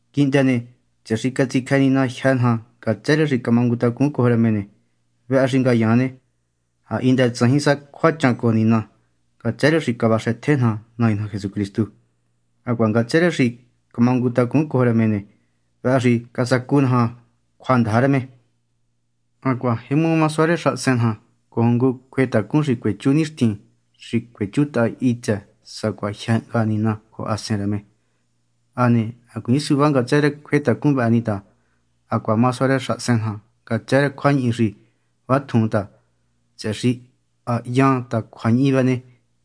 Quihndë ne, tsëhë xi catsicjë Nina jyë́ naja ngatsë rë xi camangutacun cojo rë me ne, vëhë xi ngayaan ne, ha hindë tsajin sa cjuachan cojo Nina ngatsë rë xi cavaxëtje naja Nai naja Jesucristu. Hacuaha ngatsë rë xi camangutacun cojo rë me ne, vëhë xi casacu naja cjuandaja rë me. Hacuaha jemu sua rë xahasen naja cojo ngu cjuetacun xi cuechú nixtin xi cuechuntahan hitsë sacuatjin jyë hnga Nina cojo Hasen rë me. Hane hacuiin suvá ngatsë rë cjuetacun vëhë ni ta hacuaha ma sua rë xahasen naja ngatsë rë cjuañihi xi vatjun ta, tsëhë xi ha hyan ta cjuañihi ne,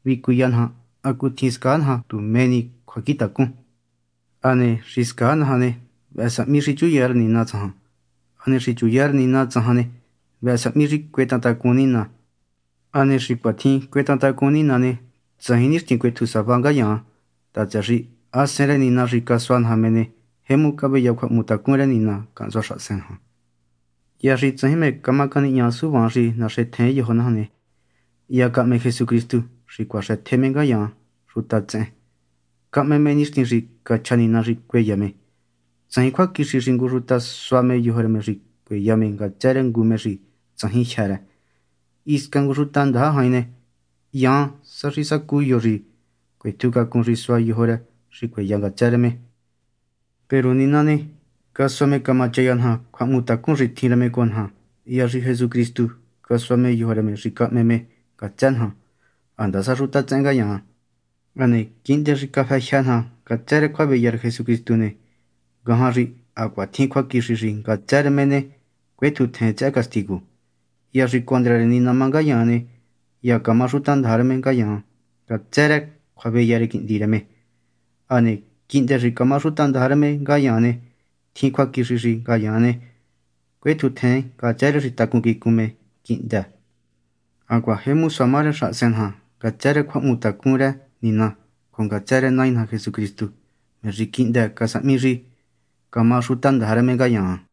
vëhë vicuya naja hacutjin scaa naja tu mé ni cjuacjintacun. Hane xi scaa naja ne, vëhë sahmi xi chuya rë Nina tsajan, hane xi chuya rë Nina tsajan ne, vëhë sahmi xi cuetahan tacun Nina. Hane xi cuatjin cuetahan tacun Nina ne, tsajin nixtin cuetju sava ngayaan ta, tsëhë xi Hasen rë Nina xi casua naja me ne, jemu caveya cjuahmutacun rë Nina cahntsua xahasen naja. Hya xi tsajin mé camá canihña suvaan xi naxentjen yojo naja ne, hya cahme Jesucristu xi cuaxëtje me ngayaan xuta tsehen. Cahme me nixtin xi cachja Nina xi cueya me. Tsajin cjuaquixi xi ngu xuta sua me yojo rë me xi cueya me ngatsë rë ngu me xi tsajin jyë́ rë. Hisca ngu xuta ndaja jain ne, hyan sa xi sacu yo xi cuetjucacun xi sua yojo rë xi cueya ngatsë rë me. Peru Nina ne, casua me camachaya naja cjuahmutacun xi tjin rë me cojo naja hya xi Jesucristu casua me yojo rë me xi cahme me ngatsë naja, handasa xuta tsehen ngayaan. Hane quihndë xi cafë jyë́ naja ngatsë rë cjuaveya rë Jesucristu ne, ngajan xi hacuaha tjin cjuaquixi xi ngatsë rë me ne, cuetjuntjen tsëhë castigu. Hya xi condra rë Nina má ngayaan ne, hya camá xutandaja rë me ngayaan ngatsë rë cjuaveya rë Quihndi rë me. Hane quihndë xi camá xutandaja rë me ngayaan ne, tjin cjuaquixi xi ngayaan ne, cuetjuntjen ngatsë rë xi tacun quicun nga me quihndë. Hacuaha jemu sua ma rë xahasen naja ngatsë rë cjuahmutacun rë Nina, cojo ngatsë rë Nai naja Jesucristu, me xi quihndë casahmi xi camá xutandaja rë Nina ngayaan.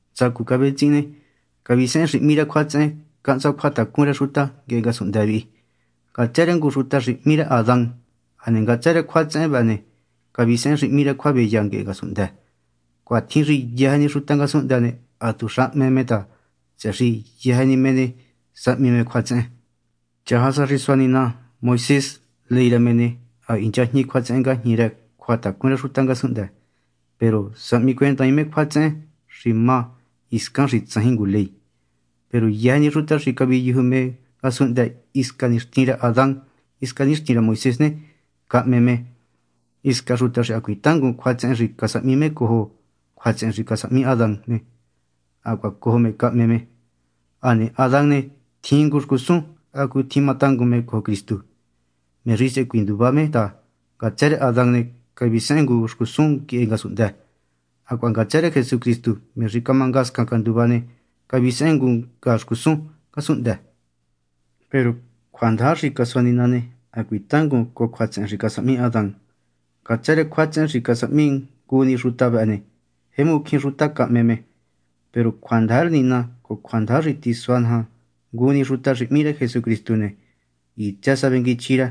Ntsacu cavetsihin ne, cavisehen xi hmí cjuatsehen cahntsua cjuatacun rë xuta nguehe ngasunhndë vihi ngatsë rë ngu xuta xi hmí rë Adán. Hane ngatsë rë cjuatsehen ne, cavisehen xi hmí cjuaveya nguehe ngasunhndë. Cuatjin xi yëjë ni xuta ngasunhndë ne, hatuxa hme me ta, tsëhë xi yëjë ni me ne, sahmi me cjuatsehen. Chaja sa xi sua Nina Moisés ley rë me ne, ha hinchajñi cjuatsehen ngajñi rë cjuatacun rë xuta ngasunhndë. Peru sahmicuendaain me cjuatsehen xi má hiscan xi tsajin ngu ley. Peru yëjë ni xuta xi caviyuju me ngasunhndë hisca nixtin rë Adán hisca nixtin rë Moisés ne, cahme me. Hisca xuta xi hacuiin tangun cjuatsehen xi casahmi me cojo cjuatsehen xi casahmi Adán ne, hacuaha cojo me cahme me. Hane Adán ne, tjin ngu xcusun hacutjin matangun me cojo Cristu, me xi sehe cuinduva me ta, ngatsë rë Adán ne, cavisehen ngu xcusun nguehe ngasunhndë, hacuaha ngatsë rë Jesucristu, me xi camangascan canduva ne, cavisehen ngu nga xcusun ngasunhndë. Peru cjuandaja xi sua Nina ne, hacuiin tangun cojo cjuatsehen xi casahmi Adán. Ngatsë rë cjuatsehen xi casahmi ngu ni xuta vëhë ne, jemu cjín xuta cahme me. Peru cjuandaja rë Nina cojo cjuandaja xi tisua naja ngu ni xuta xi hmí Jesucristu ne, hitsë sa vengui chjí rë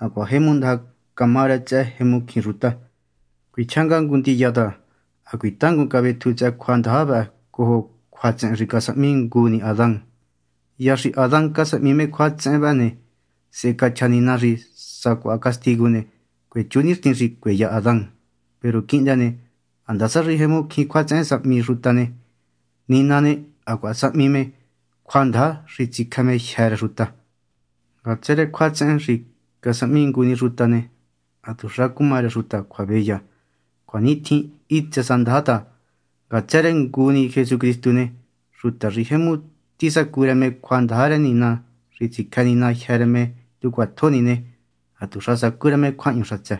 hacuaha jemu ndaja cama rë tsëhë jemu cjín xuta. Cuichjá nga ngu ndiya ta hacuiin tangun cavetju tsëhë cjuandaja vëhë cojo tsëhë cjuatsehen xi casahmi ngu ni Adán. Hya xi Adán casahmi me cjuatsehen vëhë ne, sehe cachja Nina xi sacuaha castigu ne, cuechú nixtin xi cueya Adán. Peru quihndë ne handasa xi jemu cjín cjuatsehen sahmi xuta ne, Nina ne, hacuaha sahmi me cjuandaja xi tsicjë me jyë́ rë xuta. Ngatsë rë cjuatsehen xi casahmi ngu ni xuta ne, hatuxa cuma rë xuta cjuaveya. Cuanitjin hitsë sa ndaja ta, ngatsë rë ngu ni Jesucristu ne, xuta xi jemu tisacu rë me cjuandaja rë Nina xi tsicjë Nina jyë́ rë me tu cjuatjo ni ne, hatuxa sacú rë me cjuahñu xatsë.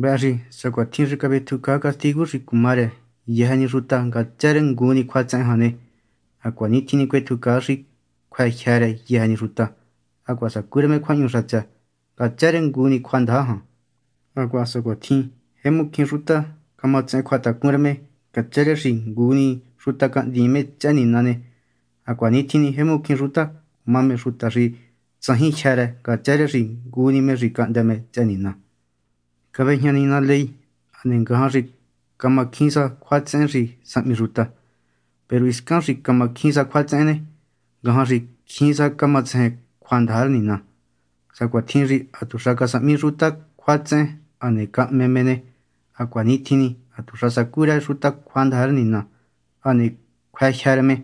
Vëhë xi sacuatjin xi cavetjucaa castigu xi cuma rë yëjë ni xuta ngatsë rë ngu cjuatsehen jan ne, hacuanitjin ni cuetjucaa xi cjuë jyë́ rë yëjë ni xuta, hacuaha sacú rë me cjuahñu xatsë, ngatsë rë ngu ni cjuandaja jan. Hacuaha sacuatjin xi jemu cjín xuta camatsehen cjuatacun rë me ngatsë rë xi ngu ni xuta cahndiin me tsëhë Nina ne, hacuanitjin ni jemu cjín xuta cuma me xuta xi tsajin jyë́ rë ngatsë rë xi ngu ni me xi cahndë me tsëhë Nina. Cavejña Nina ley hane ngajan xi cama cjín sa cjuatsehen xi sahmi xuta. Peru hiscan xi camacjín sa cjuatsehen ne, ngajan xi cjín sa camatsejen cjuandaja rë Nina. Sacuatjin xi hatuxa casahmi xuta cjuatsehen hane cahme me ne, hacuanitjin ni hatuxa sacú rë xuta cjuandaja rë Nina, hane cjuë jyë́ rë me,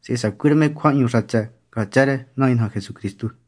sehe sacú rë me cjuahñu xatsë, ngatsë rë Nai naja Jesucristu.